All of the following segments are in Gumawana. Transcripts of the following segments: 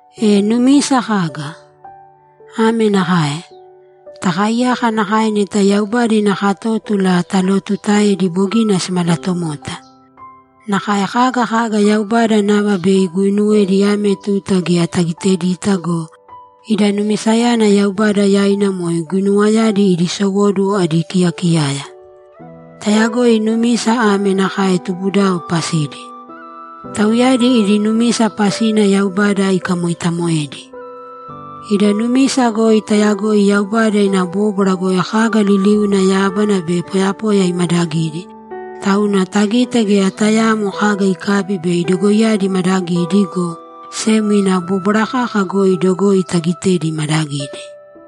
E numisa kaga? Ame nakae: Takaaiyaka nakae neta Yaubada ina katótula talotuutaedi bogina simalatomota. Nakae kaga kaga Yaubada nava bei iguinuwedi ame tuta geya tagitedita go, ida numisayana Yaubada yaina moe guinuwayadi idi sowóduwo adi kiyakiyaya. Tayagoi numisa ame nakae tubudao pasidi. Tauyadi idi numisa pasina Yaubada ikamoitamoedi. Ida numisa goi tayagoi Yaubada ina bóbwara goi kaga liliuna yábana be poyapoya imadagidi, tauna tagite geya tayaamo kaga ikabi bei dogoiyadi imadagidi, go sem ina bóbwara kaka goi dogoi taagitedi imadagidi.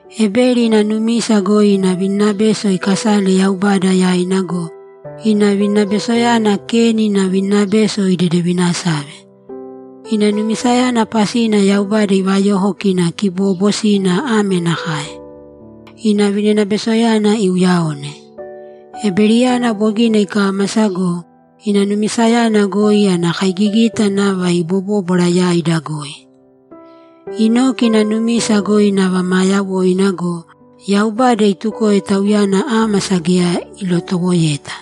Ebeli ina numisa goi ina vininabeso ikasale Yaubada yaina go, ina vininabesoyana Keni ina vininabeso idedevinasave. Ina numisayana pasina Yaubada ivayoko kina kiboobosina ame nakae: Ina vininabesoyana iuyaone. Ebeliyana bogina ikámasa go, ina numisayana goi ana kaigigita nava ibobóbwara yaida goi. Enoki ina numisa goi nava maa yawoina go, Yaubada itukoe tauyana ámasa geya ilotowoeta.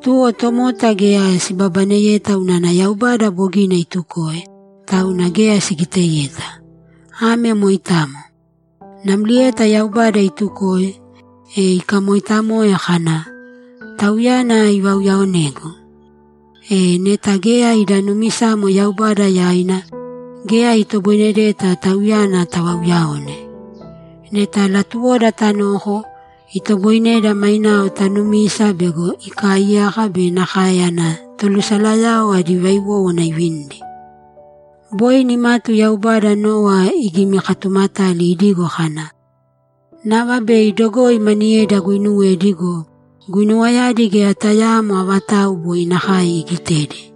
Tuwo tomota geya sibabaneyeta unana Yaubada bogina itukoe, tauna geya sigiteyeta. Ame moitamo. Namlieta Yaubada itukoe, e ikamoitamoe kana, ‘Tauyana ivauyaonegu.’ E, neta geya ida numisamo Yaubada yaina, geya itoboinedeta Tauyana tavauyaone. Neta latuwoda tanoko, itoboineda mainao tanumisa bego ikaaiyaka be nakae ana tolusalayao adi vaiwówana ivinidi. Boi nimatu Yaubada Nowa igimikatumatali idigo kana, ‘Nava bei dogoi maniyedi aguinuwedi go, guinuwayadi geya tayaamo avatau boi nakae igitedi.’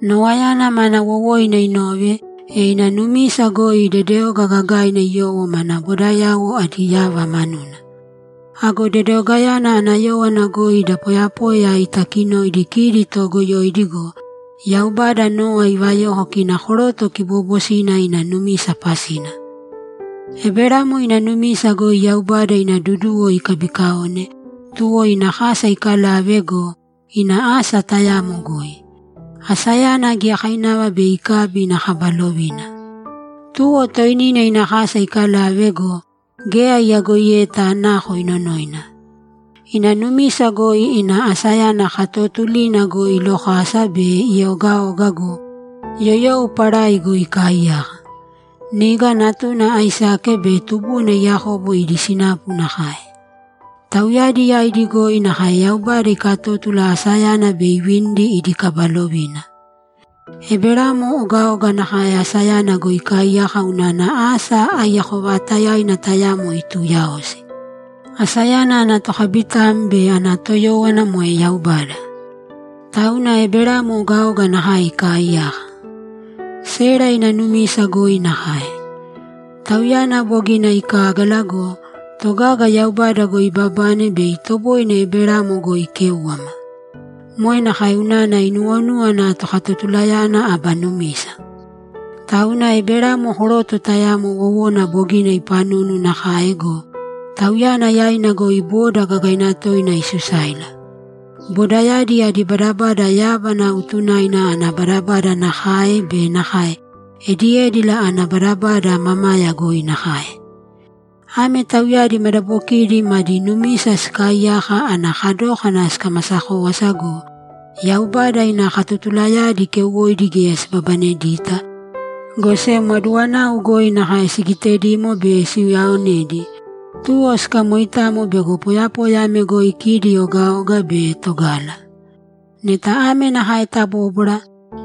Nowayana mana wowoina inove, e ina numisa goi dedeoga gagaina iyowo mana bodayauwo adi yava manuna. Ago dedeogayana ana yówana goi da poyapoya itakinoidi kidi toogoyoidi go, Yaubada Nowa ivayoko kina koroto kiboobosina ina numisa pasina. Eberamo ina numisa goi Yaubada ina duduwo ikabikaone, tuwo ina kasa ikalave go, ina asa tayamo goi. Asayana giyakainava bei ikabi ina kaba lovina. Tuwo toinina ina kasa ikalave go, geya iyagoiyeta nako inonoina. Ina numisa goi ina asayana katootulina goi ilokasa be ieogaoga go, yoyou parai goi ikaaiyaka. Niga natuna Aisake be tubuna Yakobo idi sinapu nakae. Tauyadi yaidi goi nakae Yaubada ikatótula asayana bei ivinidi idi kaba lovina. Eberamo ogaoga nakae asayana goi ikaaiyaka unana asa aiyako vaatayaina tayamo ituuyaosi; asayana ana tokabitam be ana toyówana moe Yaubada. Tauna Eberamo ogaoga nakae ikaaiyaka. Sera ina numisa goi nakae. Tauyana bogina ikágala go, togaga Yaubada goi ibabane bei itoboine Eberamo goi ikéuwama. Moe nakae unana inuwonúwana Tokatotulayana aba numisa. Tauna Eberamo koroto tayamo wowona bogina ipanunu nakae go, tauyana yaina goi boda gagaina toina isusáila. Bodayadi adi badabada yábana utunaina ana badabada nakae be nakae ediédila ana badabada mamaya goi nakae. Ame tauyadi madabokidi madi numisa sikaaiyaka ana kadókana sikamasa kówasa go, Yaubada ina katotulayadi keuwoidi geya sibabanedita, go sem aduwanau goi nakae sigitedimo be siuyaonedi, tuwo sikamoitamo bego poyapoya ame goi kidi ogaoga be togala. Neta ame nakae tabóbwara,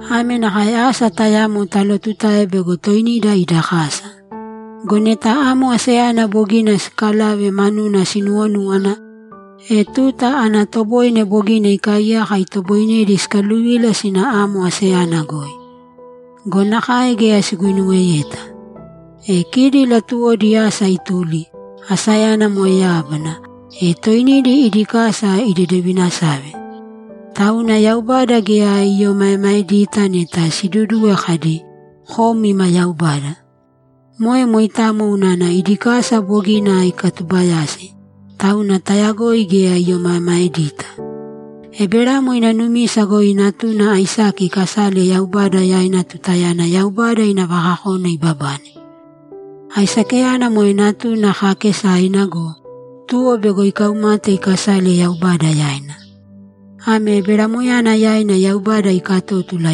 ame nakae asa tayamo talotutae bego toinida ida kasa. Go neta amo asayana bogina siikalave manuna sinuwonúwana, e tuta ana toboine bogina ikaaiyaka itoboinedi sikaluvila sina amo asayana goi. Go nakae geya siguinuweyeta. E kidi latuwodi asa ituli, asayana moe yábana, e toinidi idi kasa idedevinasave. Tauna Yaubada geya iomaemaedita neta siduduwe kadi, ‘Kom ima Yaubada.’ Moe moitamo unana idi kasa bogina ikatubayasi, tauna tayagoi geya iomaemaedita. Eberamo ina numisa goi natuna Aisake ikasale Yaubada yaina tutayana Yaubada ina vakakona ibabane. Aisakeyana moe natuna kaakesaina go, tuwo bego ikaumate ikasale Yaubada yaina. Ame Eberamoyana yaina Yaubada ikatótula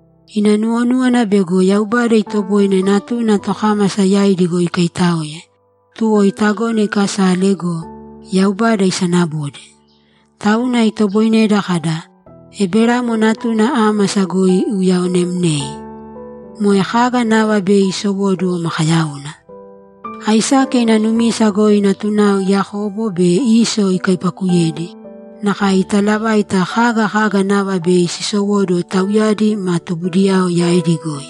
Ina nuwonúwana bego Yaubada itoboine natuna tokámasa yaidi goi ikaitáoe, tuwo itagona ikasale go, Yaubada isanabode. Tauna itoboineda kada, ‘Eberamo natuna ámasa goi iuyaonemnei.’ Moe kaga nava bei isowóduwo makayauna. Aisake ina numisa goi natunao Yakobo be Iso ikaipakuyedi, nakae italavaita kaga kaga nava bei sisowóduwo tauyadi ma tubudiyao yaidi goi.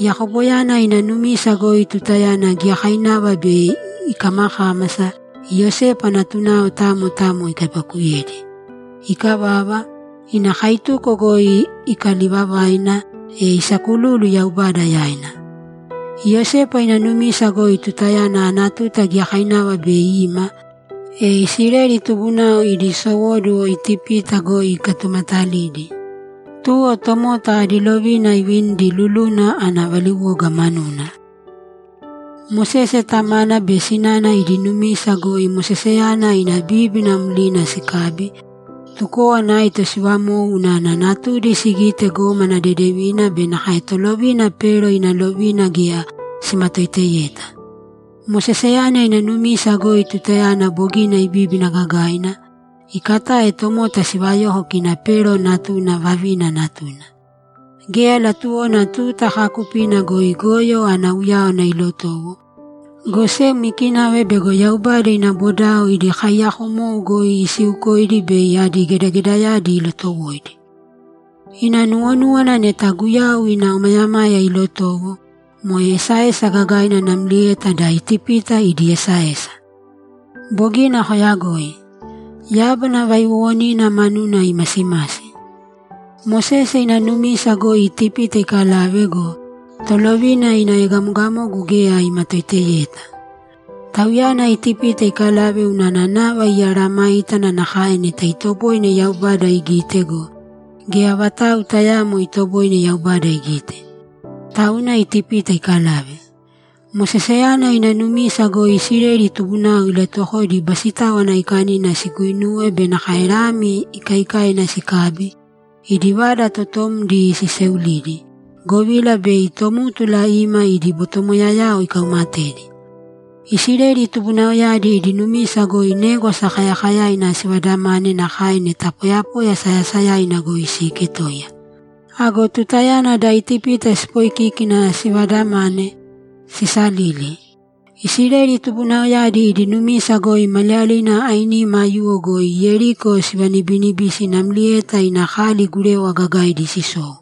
Yakoboyana ina numisa goi tutayana giyakainava bei ikamakámasa Iyosepa natunao tamo tamo ikaipakuyedi. Ikavava, ina kaituko goi ikalivavaina, e isakululu Yaubada yaina. Iyosepa ina numisa goi tutayana ana tuta giyakainava bei ima, e Isileli tubunao idi sowóduwo Itipita goi ikatumatalidi, tuwo tomota adi lovina ivinidi luluna ana valiwoga manuna. Mosese tamana be sinana idi numisa goi Moseseyana ina bíbina mlina sikabi, tukówana aito sivamou unana natudi sigite gómana dedevina be nakae tolovina Pero ina lovina geya simatoiteyeta. Moseseyana ina numisa goi tutayana bogina ibíbina gagaina, ikatae tomota sivayoko kina Pero natuna vavina natuna. Geya latuwona tuta kaakupina goi goyo ana uyáwana ilotowo, go sem ikinava bego Yaubada ina bodao idi kaiyakomou goi isiukoidi bei adi gedagedayadi ilotowoidi. Ina nuwonúwana neta Guyau ina omayamaya ilotowo, moe esaesa gagaina namlieta da Itipita idi esaesa. Bogina koyagoi. Yábana vaiwowonina manuna imasimasi. Mosese ina numisa goi Itipita ikalave go, tolovina ina egamogamogu geya imatoiteyeta. Tauyana Itipita ikalave unana nava imeesayágana nakae neta itoboine Yaubada igite go, geya vatau tayaamo itoboine Yaubada igite. Tauna Itipita ikalave. Moseseyana ina numisa goi Isileli tubunao ilatuwokoidi Basitáwana Aikanina siguinuwe be nakae lami ikaikaina sikabi, idi vada totomdi siseulidi, govila bei tómtula ima idi botomoyayao ikaumatedi. Isileli tubunaoyadi idi numisa goi Négwasa Kayakayaina sivadamane nakae neta poyapoya sayasayaina goi siiketoiya. Ago tutayana da Itipita sipoikíkina sivadamane, sisalili! Isileli tubunaoyadi idi numisa goi maliyalina ainima aiyuwo goi Yeriko sivanibinibisi namlieta ina kali gurewa gagaidi sisou.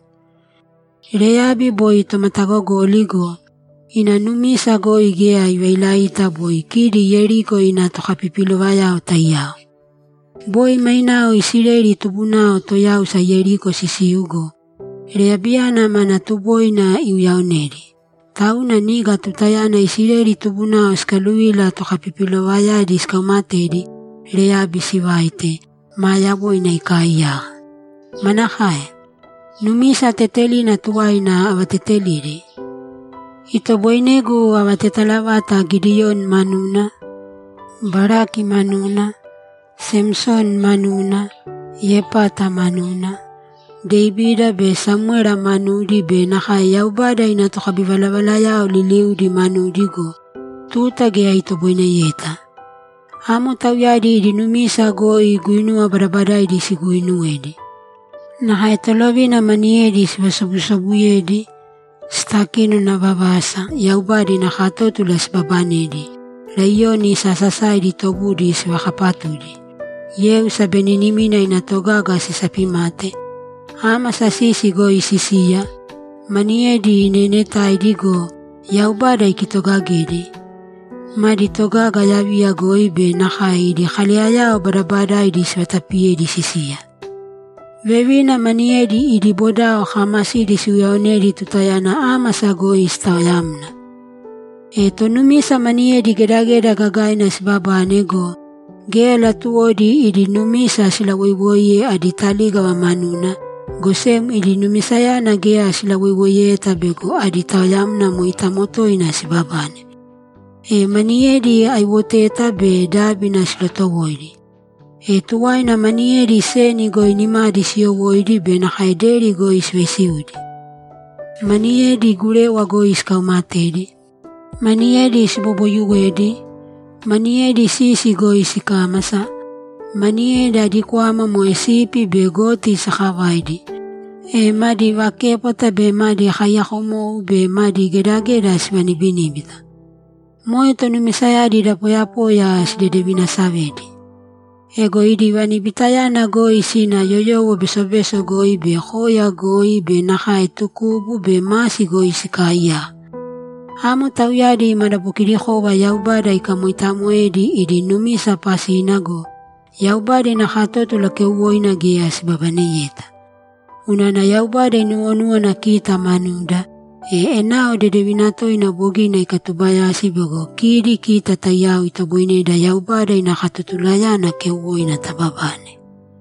Reyabi boi tomatagogoli go, ina numisa goi geya ivailaita boi kidi Yeriko ina tokapipilovayao taiyao. Boi mainao Isileli tubunao toyáusa Yeriko sisiu go, Reyabiyana mana tuboina iuyaonedi, tauna niga tutayana Isileli tubunao sikaluvila tokapipilovayadi sikaumatedi, Reyabi sivaite, maa yawoina ikaaiyaka. Manakae? Numisa tetelina tuwaina avatetelidi? Itoboinegu avatetala vata Gidiyoni manuna, Baraki manuna, Samsoni manuna, Yepata manuna, Devida be Samwera manudi be nakae Yaubada ina tokabivalavalayao liliudi manudi go, tuta geya itoboineyeta. Amo tauyadi idi numisa goi guinuwa badabadaidi siguuinuwedi. Nakae tolovina maniyedi sivasobusobuyedi, sitakinona vavasa, Yaubada ina katótula sibabanedi, laiyoni sasasaidi tobudi sivakapatudi, yeu sabeninimina ina togaga sisapimate, ámasa sisi goi sisiya, maniyedi neenetaidi go, Yaubada ikitogagedi, madi togaga yaviya goi be nakae idi kaleyayao badabadaidi sivatapiyedi sisiya. Vevina maniyedi idi bodao kaamasidi siuyaonedi tutayana ámasa goi sitaoyamna. E tonumisa maniyedi gedageda gagaina sibabane go, geya latuwodi idi numisa silawoiwoiye adi talígava manuna, go sem idi numisayana geya silawoiwoiyeta bego adi taoyamna moitamo toina sibabane. E maniyedi aiwoteta be dábina silotowoidi. E tuwaina maniyedi seni goi nimadi siyowóidi be nakae deri goi sivaisiudi. Maniyedi gurewa goi sikaumatedi, maniyedi siboboyuwedi, maniyedi sisi goi sikámasa, maniyedi adi kwama moe sipi be goti sakavaidi, e madi vaképwata be madi kaiyakomou be madi gedageda sivanibiníbita. Moe tonumisayadi da poyapoya sidedevinasavedi. Ego idi vanibitayana goi sina yoyowo besobeso goi be koya goi be nakae tukubu be masi goi sikaaiyaka. Amo tauyadi madabokidikova Yaubada ikamoitamoedi idi numisa pasina go, Yaubada ina katótula keuwoina geya sibabaneyeta. Unana Yaubada inuwonúwana kita manuda, e enao dedevina toina bogina ikatubayasi bego kidi kita taiyao itoboineda Yaubada ina katotulayana keuwoina tababane.